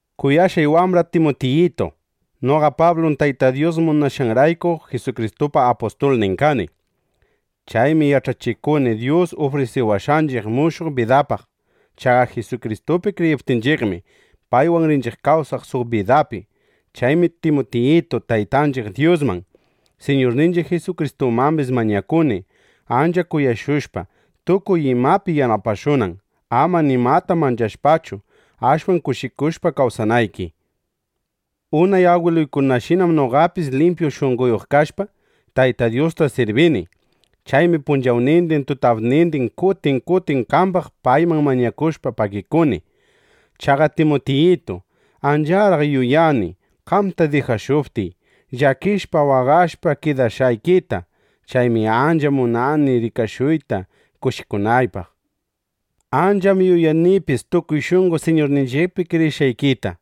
Kuyashqay wambra Timutiyitu, noqa Pablum Tayta Dyus munashqanrayku, Jisukristupa apustulnin kani. Chaymi yach'achikuni Dyus ufrisiwashqanchiq mushuq bidapaq. Chaqa Jisukristupi kriyiptinchiqmi, paywan rinchiq kawsaq suq bidapi. Chaymi Timutiyitu, Taytanchiq Dyusman, Siñurninchiq Jisukristumambis mañakuni, ancha kuyashushpa, tukuy imapi yanapashunan, ama nimata manchashpachu, ashwan kushikushpa kawsanayki. Unay agwiluykunashinam noqapis limpyu shunqoyuq kashpa, Tayta Dyusta sirbini. Chaymi punchawnindin tutapnindin kutin kutin qambaq payman mañakushpa, pagikuni. Chaqa Timutiyitu, ancharaq yuyani, qamta dijashuptiy, llakishpa waqashpa kidashqaykita. Chaymi ancha munani rikashuyta kushikunaypaq. Ancham yuyanipis tukuy shunqo Siñurninchiqpi kriyishqaykita.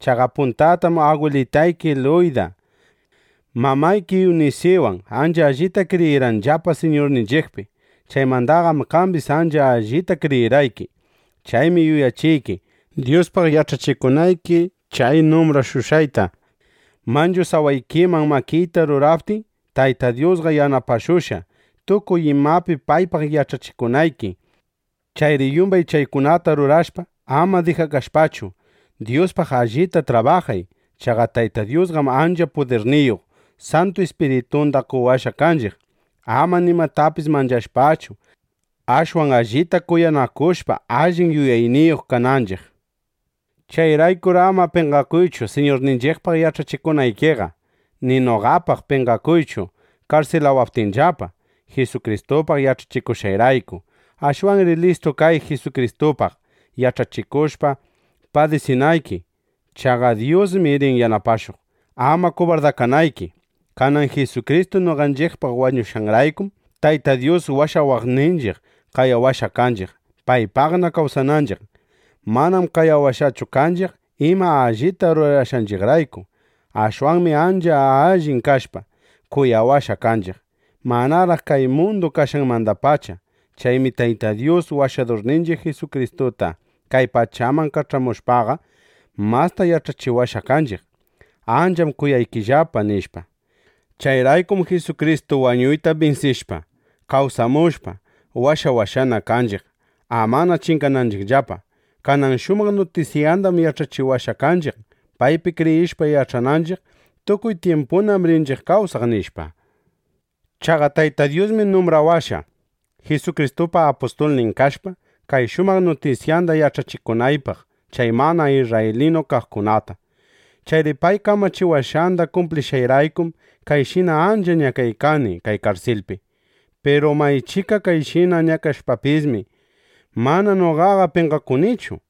Chaqa puntatam agwilitayki Luyda, mamayki Iwnisiwan ancha allita kriyirqanllapa Siñurninchiqpi. Chaymandaqam qambis ancha allita kriyirqayki. Chaymi yuyachiyki, Dyuspaq yach'achikunayki chay numbrashushqayta. Manchu sawaykiman makiyta ruraptiy, Tayta Dyusqa yanapashushqa, tukuy imapi paypaq yach'achikunayki. Chayri yumbay chaykunata rurashpa, ama dijakashpachu, Dyuspaq allita trabajay. Chaqa Tayta Dyusqam ancha pudirniyuq Santu Ispiritunda qowashqa kanchiq, ama nimatapis manchashpachu, ashwan allita kuyanakushpa, allin yuyayniyuq kananchiq. Chayraykur ama penqakuychu Siñurninchiqpaq yach'achikunaykiqa ni noqapaq penqakuychu karsilawaptinllapa, Jisukristupaq yach'achikushqayrayku. Ashwanri listu kay, Jisukristupaq yach'achikushpa, padisinayki. Chaqa Dyusmi rin yanapashuq, ama kubardakanayki. Kanan Jisukristu noqanchiqpaq wañushqanraykum, Tayta Dyus washawaqninchiq, qayawashqa kanchiq, paypaqna kawsananchiq. Manam qayawashqachu kanchiq, ima allita rurashqanchiqrayku. Ashwanmi ancha allin kashpa, kuyawashqa kanchiq, manaraq kay mundu kashqanmandapacha. Chaymi Tayta Dyus Washadurninchiq Jisukristuta kay pachaman kach'amushpaqa, masta yach'achiwashqa kanchiq: Ancham kuyaykillapa, nishpa. Chayraykum Jisukristu wañuyta binsishpa, kawsamushpa, washawashqana kanchiq, amana chingananchiqllapa. Kanan shumaq nutisyandam yach'achiwashqa kanchiq, paypi kriyishpa, yach'ananchiq: Tukuy tyimpunam rinchiq kawsaq, nishpa. Chaqa Tayta Dyusmi numbrawashqa, Jisukristupa apustulnin kashpa, kay shumaq nutisyanda yach'achikunaypaq chay mana isrraylinu kaqkunata. Chayri pay kamachiwashqanda kumplishqayraykum, kayshina ancha ñakaykani kay karsilpi. Piru maychika kayshina ñakashpapismi, mana noqaqa penqakunichu.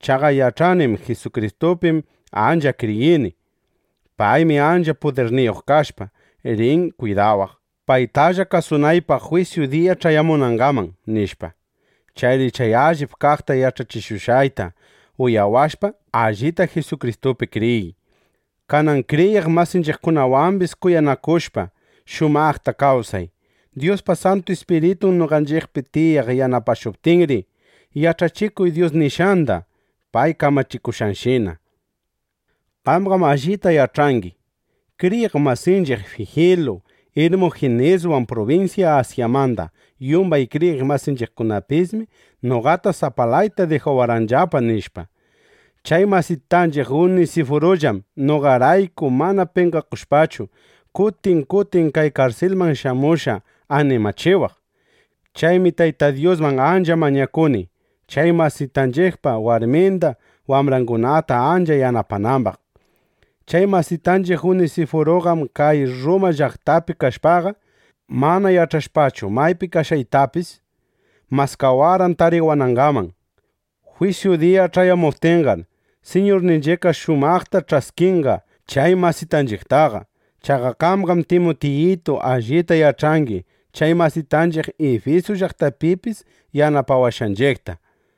Chaqa yach'anim: Jisukristupim ancha kriyini. Paymi ancha pudirniyuq kashpa, rin kwidawaq, paytalla kasunaypaq jwisyu diya ch'ayamunangaman, nishpa. Chayri chay allip kaqta yach'achishushqayta uyawashpa, allita Jisukristupi kriyiy. Kanan kriyiq masinchiqkunawambis kuyanakushpa, shumaqta kawsay. Dyuspa Santu Ispiritun noqanchiqpi tiyaq yanapashuptinri, yach'achikuy Dyus nishqanda, pay kamachishushqanshina. Qamqam allita yach'angi: Kriyiq masinchiq Fijilu Irmujiniswan prubinsya Asyamanda yumbay kriyiq masingunapismi noqata sapalayta dijawarqanllapa, nishpa. Chay masitanchiq Unisifurullam noqarayku mana penqakushpachu, kutin kutin kay karsilman shamushqa animachiwaq. Chaymi Tayta Dyusman ancha mañakuni, chay masitanchiqpa warminda wambrangunata ancha yanapanambaq. Chay masitanchiq Unisifuruqam kay Rruma llaqtapi kashpaqa, mana yach'ashpachu maypi kashqaytapis, maskawarqan tariwanangaman. Jwisyu diya ch'ayamuptinqar, Siñurninchiqqa shumaqta ch'askinqa chay masitanchiqtaqa. Chaqa qamqam Timutiyitu allita yach'angi chay masitanchiq Ifisu llaqtapipis yanapawashqanchiqta.